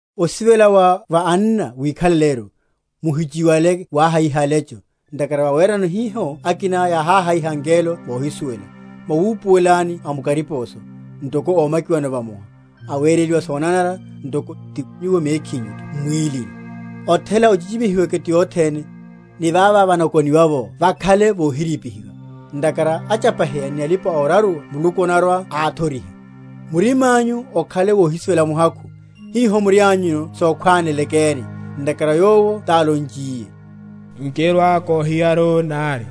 Osivela wa va anna wikhaleleru. Muhichiwale wahayiha alecho; ntakhara vawerano hiho akina yáháhayiha angelo mohisuwela. Mwawupuwelani amukariposo, ntoko ómakiwano vamoha; awereliwa sonanara, ntoko ti nyuwo mekhinyutho m’mwílini. Othela ochichimihiweke ti othene, ni vava vanako?-?niwa’vo vakhale vohirípihiwa; ntakhara achapaheya ni alipa‐oraruwa Muluku anarwa‐áthoriha. Murimányu okhale wohisivela muhakhu, hiho murianyuno sokhwánelekeni; ntakhara Yowo tálonchiye, Nkirwa‐kohiyaru nari,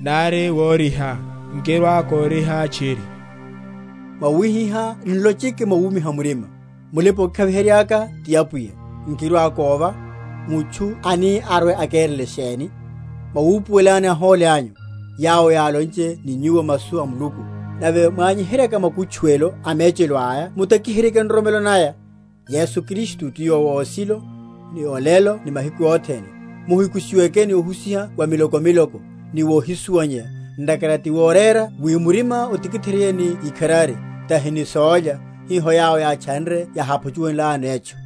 nari woriha, nkirwa‐koriha tchiri. Mwawihiha nlocheke mwawumiha murima, Mulipa‐okikhaviheryaka ti Apwiya; nkirwa‐kóva; Mutchu ani arwe‐akerele sheni? Mwawupuwelani ahóli anyu, yawo yálonche ni nyuwo masu a Muluku; nave mwanyiheryaka makutchuwelo a mechelo aya mutakiheryeke nroromelo naya. Yesu Kristu ti yowo osilo, ni olelo ni mahiku othene, muhikushiweke ni ohusiha wa miloko miloko, ni wohisuwanyeya; ntakhara ti worera wi murima otikitheryeye ni ikharari; tahi ni sólya, hiho yawo yátchanre yaháphuchunlayano etchu.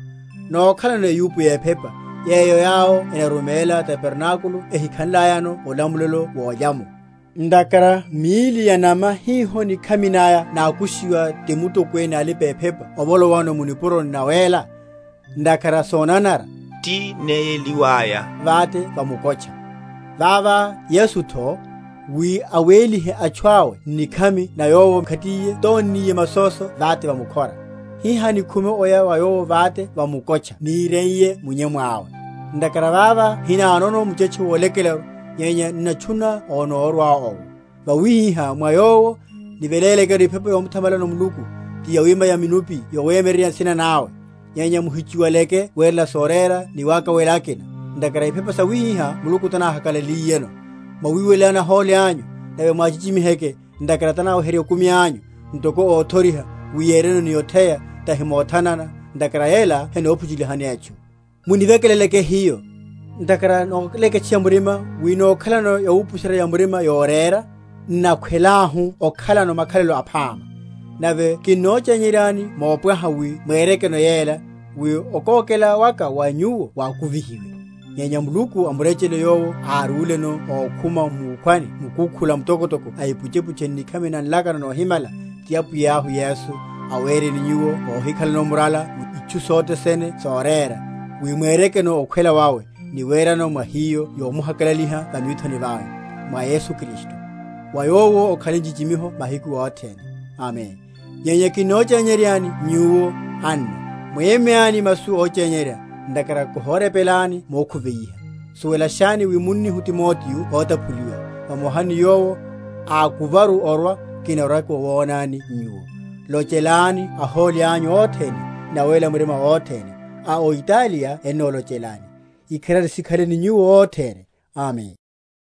Nókhalano eyupo yephepa, yeyo yawo enaruméla tabernákulo ehikhanlayano olamulelo wolya’mo. Ntakhara míli ya’nama hiho nikhami naya nákushiwa ti mutokwene a alipa‐ephepa ovolowano mu nipuroni nawéla, ntakhara sonanara, tinéyeliwaya vate va mukotcha. Vavá Yesutho, wi awélihe atchu awo n’nikhami na Yowo mkhatiye tónniye masóso vate va mukhora. Hihá nikhume oya wa Yowo vate va mukotcha níreiye munyemu awe. Ntakhara vava hinanono muchetche wolekelaru, nyenya n’natchu?-?natchuna onórwa owo. Vawihiha, mwa Yowo, nivelélekeru ephepa yomuthamalano Muluku, ti yawima ya minuphi yawemyeryerya nsina nawe. Nyenya muhichiwaleke werela sorera ni wakawela akina; ntakhara iphepa sawihiha Muluku tanahakalaliyeno. Mwawiwelelani ahóli anyu, nave mwáchichimiheke; ntakhara tanaweherya okumi anyu, ntoko óthoriha; wi yereno ni otheya, tahi mothanana; ntakhara yela henophuchulihani etchu. Munivekeleleke hiyo; ntakhara nóleketcheya murima wi nókhalano yawupusherya‐ya‐murima yorera, n’nakhwelahu okhalano makhalelo aphama. Nave kinnochenyeryani mopwaha wi mwerekeno yela, wi okókela waka wa nyuwo wakuvihiwe. Nyenya Muluku a murechele yowo árúleno ókhuma mukhwani mukukhula mtokotoko a ipuchepuche n’nikhami na nlakano nohimala, ti Apwiyahu Yesu, awereni nyuwo óhikhalano murala mu itchu sothe sene sorera, wi mwerekeno okhwela wawe; ni werano mwa hiyo yomuhakalaliha va mithoni vawe, mwa Yesu Kristu; wa Yowo okhale nchichimiho mahiku othene. Amen. Nyenya kinnochenyeryani nyuwo, anna, mwémyáni masu óchenyerya; ntakhara kórepenlakani mokhuveiha. Suwelashani wi munnihu Timoteo ótaphuliwa; vamoha ni yowo, ákuvaru orwa, kinarwa‐kiwonani nyuwo. Lochelani ahóli anyu othene, ni awéla murima othene. A o Italiya ennolochelani. Ikharari sikhale ni nyuwo othene. Amen.